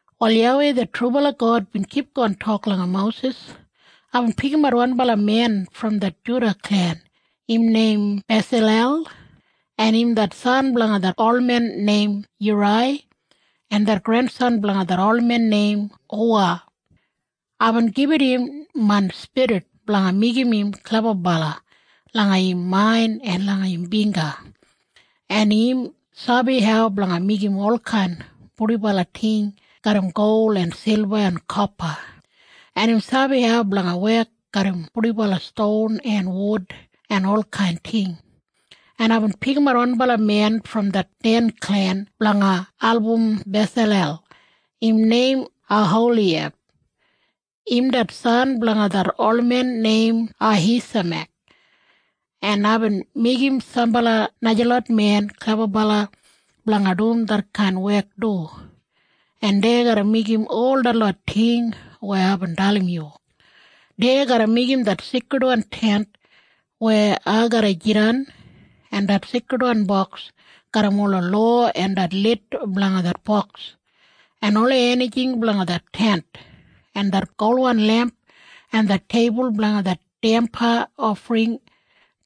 Wal YAWEI det trubala God bin kipgon tok langa Mosis, “Aibin pikimat wanbala men brom det Juda klen. Im neim Besalel, en im det san blanga det olmen neim Yurai en det grensan blanga det olmen neim Huwa. Aibin gibit im main spirit blanga meigim im klebabala langa im main en langa im bingga, en im sabi hau blanga meigim olkain purdibala ting garram gol en silba en kopa, en im sabi hau blanga wek garram purdibala ston en wud en olkain ting. En aibin pikimat wanbala men brom det klen blanga Den blanga album Besalel. Im neim Oholiyab. Im det san blanga det olmen neim Ahisamek. En aibin meigim sambala najalot men klebabala blanga dum detkain wek du, en dei garra meigim ol detlot ting weya aibin dalim yu. Dei garra meigim det Seikridwan Tent weya ai garra jidan en det Seikridwan Boks garram ola lowa en det lid blanga det boks en ola enijing blanga det Tent en det golwan lemp en det teibul blanga det damba ofring en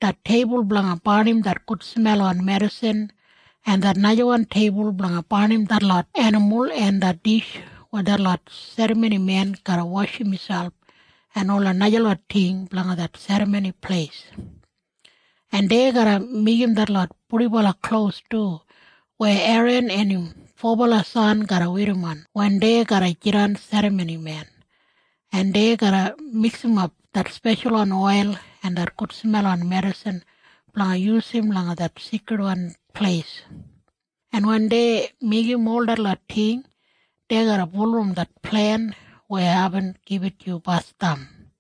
det teibul blanga barnim det gudsmelwan medisin en det najawan teibul blanga barnim detlot enimul en det dish weya detlot serramonimen garra washim miselp en ola najalot ting blanga det Serramoni Pleis, en dei garra meigim detlot purdibala klos du weya Eran en im fobala san garra werrim wen dei garra jidan serramonimen, en dei garra miksimap det speshalwan oil en det gudsmelwan medisin blanga yusum langa det Seikridwan Pleis. En wen dei meigim ol detlot ting, dei garra bulurrum det plen weya aibin gibit yu basdam.”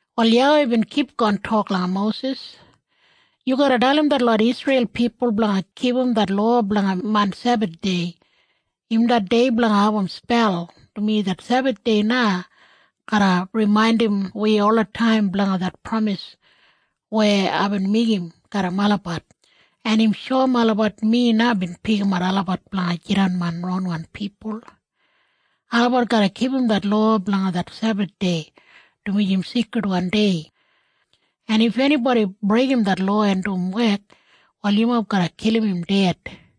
Wal YAWEI bin kipgon tok langa Mosis, “Yu garra dalim detlot Isreil pipul blanga kipum det lowa blanga main Sebathdei. Im det dei blanga abum spel, dumaji det Sebathdei na garra rimaindim wi olataim blanga det pramis weya aibin meigim garram olabat, en im shoum olabat mi na bin pikimat olabat blanga jidan main ronwan pipul. Olabat garra kipum det lowa blanga det Sebathdei, dumaji im seikridwan dei. En if enibodi breigim det lowa en dum wek, wal yumob garra kilim im ded.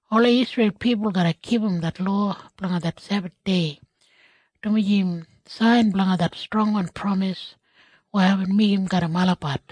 Ola Isreil pipul garra kipum det lowa blanga det Sebathdei, dumaji im sain blanga det strongwan pramis weya aibin meigim garram olabat,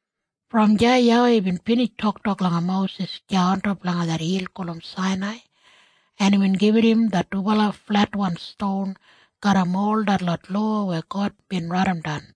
Brom deya YAWEI bin binij toktok langa Mosis deya ontop langa det hil gulum Sainai, en imbin gibit im det dubala fletwan ston garram ol detlot lowa weya God bin raidimdan.